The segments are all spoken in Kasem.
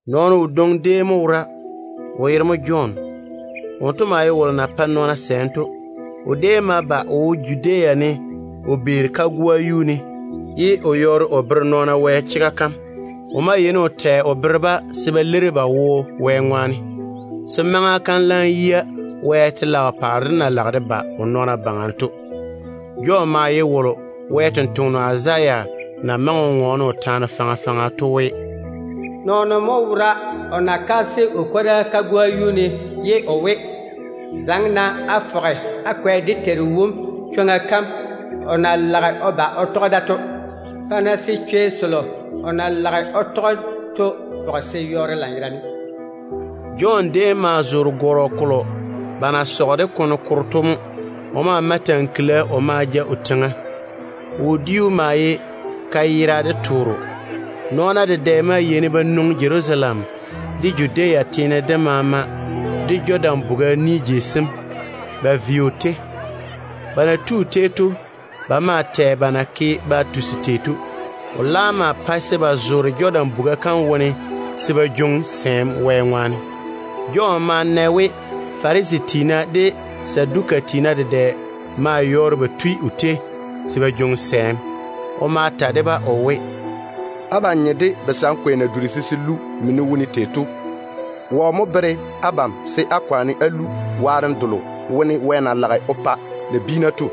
Nɔɔno wodwoŋi déem mo wora, o yere mo Jɔn. Wonto déem yeini o pae nɔɔna sɛɛm mo. O ma ba o zoore Judea kagoa kam ne, ye o yɔɔre o bere nɔɔna Wɛ chega kam. O maa yeini o tɛ o bere-ba se ba leiri ba wo Wɛ ŋwaane, se maŋa kam laam yia se Wɛ telaao paare dem ba o nɔɔna baŋa. Jɔn ye wolo Wɛ sampwora Izaya na maŋe o ŋɔɔne o taane faŋa faŋa to we: “Nɔɔno mo wora o kaase o kwora kagoa yuu ne ye o we, ‘Zaŋe-na á fɔge á kwɛ dé Teiru wom chwoŋa kam o na lage o ba o tɔge da to. Pa-na se chwei selo o na lage o tɔge to fɔge se yɔɔre lanyerane.’” Jɔn déem zoore gɔrɔ kolo ba na sɔge de kone koro to mo. O maa jege tankila o ma ja o teiŋa. O wodiu mo ye kayere de tooro. Nɔɔna dedɛ maa yeini ba nwoŋi Jerusalem, de Judea teene dem maama, de Jɔdan buga kam ni jei sem, ba vei o tei. Ba na tui o tei to, ba maa tɛ jaja ba na ke ba tusi tei to. O laam maa pae se ba zoore Jɔdan buga kam wo se ba jwoŋi sɛɛm Wɛ ŋwaane. Jɔn ma na we Farisi tiina de Saduka tiina dedɛ yɔɔre ba tui o tei se ba jwoŋi sɛɛm. O ma ta de-ba o we: “Abam nye de basankwe na dura se se lu mini wone tei to. Wɔ mo bere abam se á kwaane á lu waarem delo Wɛ na lage o pa nabiina to?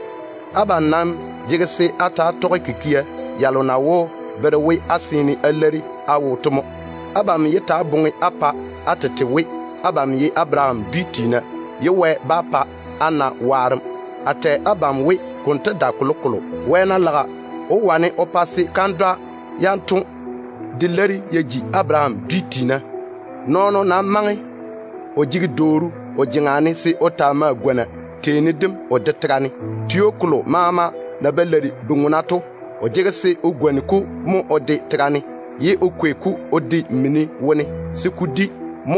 Abam nam jege se á ta‑á tɔge kikia yalo na wó bere we á seene á leiri á wo to mo. Abam yé ta‑á boŋa á pa á tete we, abam ye Abaraham dwi tiina, ye Wɛ bá pa á na waarem. A tɛ abam we konto dae kolokolo. Wɛ ná laga, o wó wane o pa se kandwa yanto de leiri ya ji Abaraham dwi tiina. Nɔɔno nam maŋe o jege dwooru o jeŋa ne se o taa mae o gwoni teeni mo o de tega ne. Tio kolo maama na ba leiri bu-ŋona to, o jege se o gwoni-ko mo o de tega ne, ye o kwei-ko o de mini wone se ko di.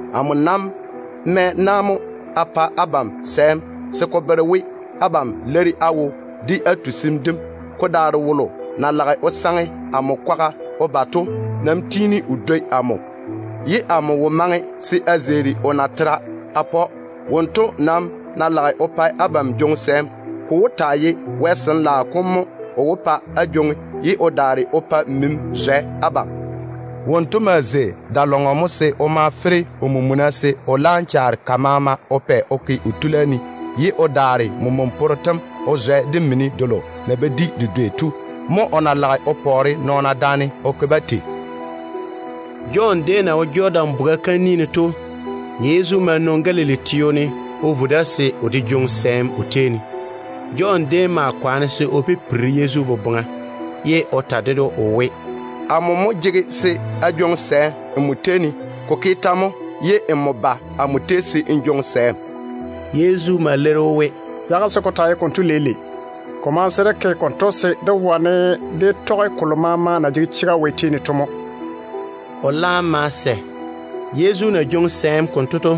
Amo nam mae na mo a pa abam sɛɛm se ko bere we abam leiri á wo de á tusim dem. Ko daare wolo na lage o saŋe amo kwaga o ba to nam tiini o dwoi amo. A wo maŋe se a zeeri o nɛ natera de. Wonto nam ná lage o pa abam jwoŋi sɛɛm, ko wó taa ye Wɛ Sin-laao kom dedaane mini mo o ma o ke konto. Wonto maa zei da-lɔŋɔ se o ma mage o mena, se o laam chaare ka maama o pɛ o ke o tula ne, ye o daare men-swanno tem o zwɛ de mini delo na ba di de dwei to. Mo o na lage o pɔɔre nɔɔna daane o ke-ba tei.” Jɔn déem na wo Jɔdan buga kam ni ne to, Yezu ma nwoŋi Galili laŋa kam o vo da se o de jwoŋi sɛɛm o tei ne. Jɔn déem ma kwaane se o pipiri Yezu boboŋa, ye o ta ded‑o o we, “Amo mo jege se a jwoŋi sɛɛm nmo tei ne. Ko ke tɛ mo ye nmo ba amo tei se n jwoŋi sɛɛm?” Yezu ma leiri‑o we, “Yage se ko taa ye konto leile. Ko maŋe se dé ke konto, se dé wane dé tɔge kolo maama na jege chega Wɛ tei ne to mo.” O laam ma sɛ. Yezu na jwoŋi sɛɛm konto to,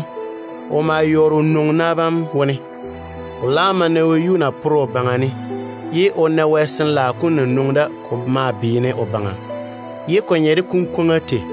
o ma yɔɔre o nwoŋi na bam wone. O laam ma na wɛyuu na pore o baŋa ne, ye o na Wɛ Sin-laao kom na nwoŋi da ko maa beene o baŋa, ye ko nye de kunkwoŋa tei.